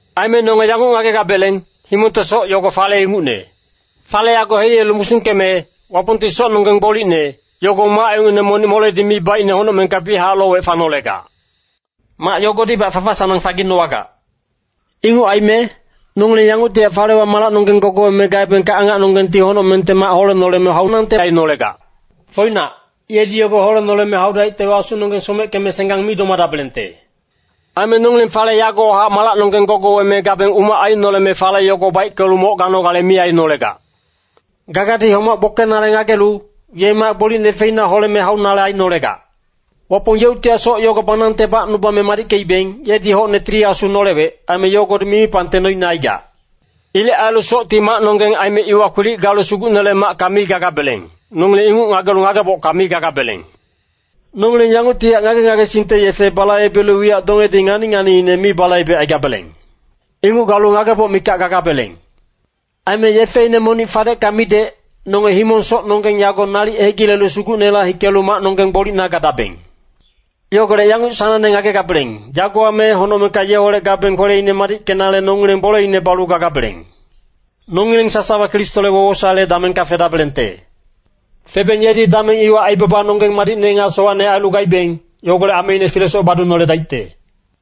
Aime nonge yanguc ngagegabeleng, himongte soc yogo fale ingucne. Fale yago heliyelu musungkeme, Wapongti socnonggeng gbolicne, yogo mac ingucne monic moledi mi baicne honocmengka biyachac lowec fanolegac. Mac yogodibac fafa-sanang faginowagac. Inguc aime nongileng yanguctihac falewa malacnonggeng gogoweme gaebengka, angacnonggengti honocmengte mac holenoleme haunangte ainolegac. Foinac, yedi yogo holenoleme haudaictewa, asunonggeng someckeme senggang mi domadabelengte. Aime nongileng fale yagowahac malacnonggeng gogoweme gabeng, umac ainoleme fale yogo baickelu moc ganogale mi ainolegac. Gagadi homac gbokenale ngagelu, ye mac gbolicne feina holeme haunale ainolegac. Wapong yeuctihac soc yogo banangte bacnubame madickeibeng, yedi hocne Tili Asu nolewec, aime yogodi mimipangte noine aigac. Ilec ailu socti macnonggeng aime iwa kwilic galu Sugucnele macka mi gagabeleng, nongileng inguc ngagelu ngagebocka mi gagabeleng. Nongileng yanguctihac ngage-ngagesingte yefe balaibelu wiyac dongedi ngani-nganiine mi balaibecaigabeleng. Inguc galu ngageboc mikac gagabeleng. Aime yefeine monic fadecka midec, nonge himong-socnonggeng yago nalic hegilelu Sugucnela hikelu macnonggeng gbolicna gadabeng. Yogolec yanguc sanangne ngagegabeleng, yagowa me honocmengka yeholec gabeng kweleine madickenale nongileng boleine balu gagabeleng. Nongileng sasawa Kristole wowosaele damengka fedabelengte. Febeng yedi dameng iwa aibabanonggeng madicne nga sowacne ailu gaibeng, yogolec ameine filesoc badunoledaicte.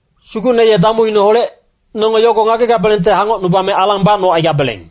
Sugucne ye damuineholec, nonge yogo ngagegabelengte hangocnubame alang bacnocaigabeleng.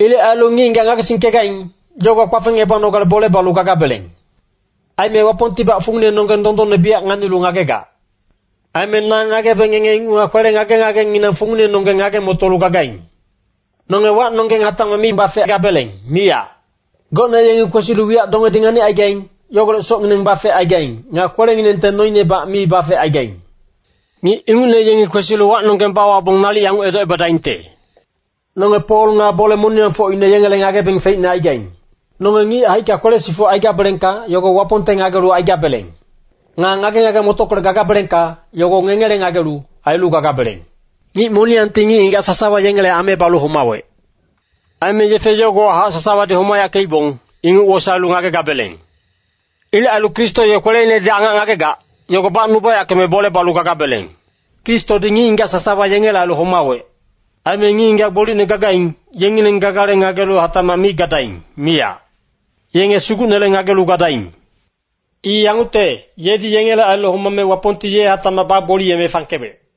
Ilec ailu ngic-ngigac ngagesingkegaing, yogowa kpafengebanogale bole balu gagabeleng. Aime Wapongtibac funginenonggeng dondonne biyac nganilu ngagegac. Aime na ngagebe ngenge inguchac kwele ngage-ngagenginang funginenonggeng ngage-motolu gagaing. Nonge wacnonggeng hatacmac mi bafegabeleng, miyac. Gocne yengi kwesilu wiyac dongedi nganicaigaing, yogolec socngineng bafecaigaing. Nga kwelenginengte noinebac mi bafecaigaing. Ngic ingucne yengi kwesilu wacnonggeng bawabong nalic yanguc edocebadaingte, “Nonge Pol nga bole-moniyangfocine yengele ngagebeng feicne aigaing.” Nonge ngic haicka kwele-sifuc aigabelengka, yogo Wapongte ngagelu aigabeleng. Nga ngage-ngage-motockolec gagabelengka, yogo ngengele ngagelu, ailu gagabeleng. Ngic moniyangti ngic-ngigac sasawa yengele ame balu homawec. Aime yefe yogowahac sasawadi homayackeibong, inguc wosaelu ngagegabeleng. Ilec ailu Kristo ye kweleinedi angac ngagegac, yogo bacnubayackeme bole balu gagabeleng. Kristodi ngic-ngigac sasawa yengele ailu homawec. Aime ngic-ngigac gbolicne gagaing, yengileng gagale ngagelu hatacmac mi gadaing, miyac. Yenge Sugucnele ngagelu gadaing. I yangucte, yedi yengele ailu homame Wapongti ye hatacmac bagboliyeme fangkewec.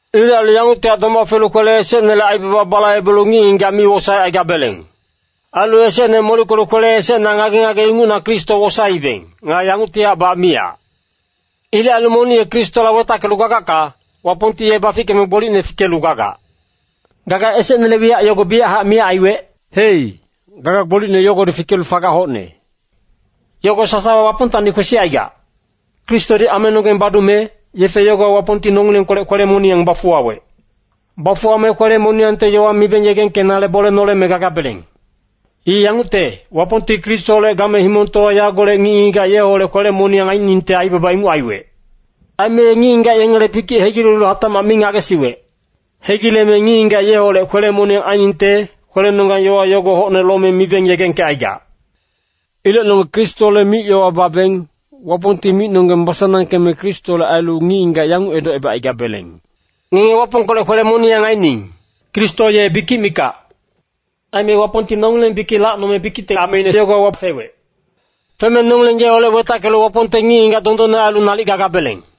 Ilec ailu yanguctihac doma felu kwele esecnele aibaba balaibelu ngic-ngigac mi wosaecaigabeleng. Ailu esecne molickelu kwele esecna ngage-ngage ingucna Kristo wosaeibeng. Nga yanguctihacbac miyac. Ilec ailu monic ye Kristoholec wetackelu gagacka, Wapongti ye bafickeme gbolicne fikelu gagac. Gaga esecnele wiyac yogo biyachac miyac aiwec. Hei, gaga gbolicne yogodi fikelu fagac hocne. Yogo sasawa Wapongtacni kwesicaigac. Kristodi amenonggeng badume, yefe yogowa Wapongti nongilengkolec kwele-moniyang bafuwawec. Bafuwame kwele-moniyangte yowa mibeng yegengkenale bole noleme gagabeleng. I yangucte, Wapongti Kristoholec game himongtowa yagolec ngic-ngigac yeholec kwele-moniyang ainingte aibaba inguc aiwec. Aime ye ngic-ngigac yengele bikic hegilelu hatacmac mi ngagesiwec. Hegileme ngic-ngigac yeholec kwele-moniyang ainingte, kwelenonggang yowa yogo hocne lome mibeng yegengkecaigac. Ilec nonge Kristole mic-yowa babeng, Wapongti micnonggeng basanangkeme Kristole ailu ngic-ngigac yanguc edocebacaigabeleng, “Ngenge Wapongkolec kwele-moniyang aining.” Kristo ye bikic mikac. Aime Wapongti nongileng bikic lacnome bikicte ameine yogowa fewec. Feme nongileng yeholec wetackelu Wapongte ngic-ngigac dondonne ailu nalic gagabeleng.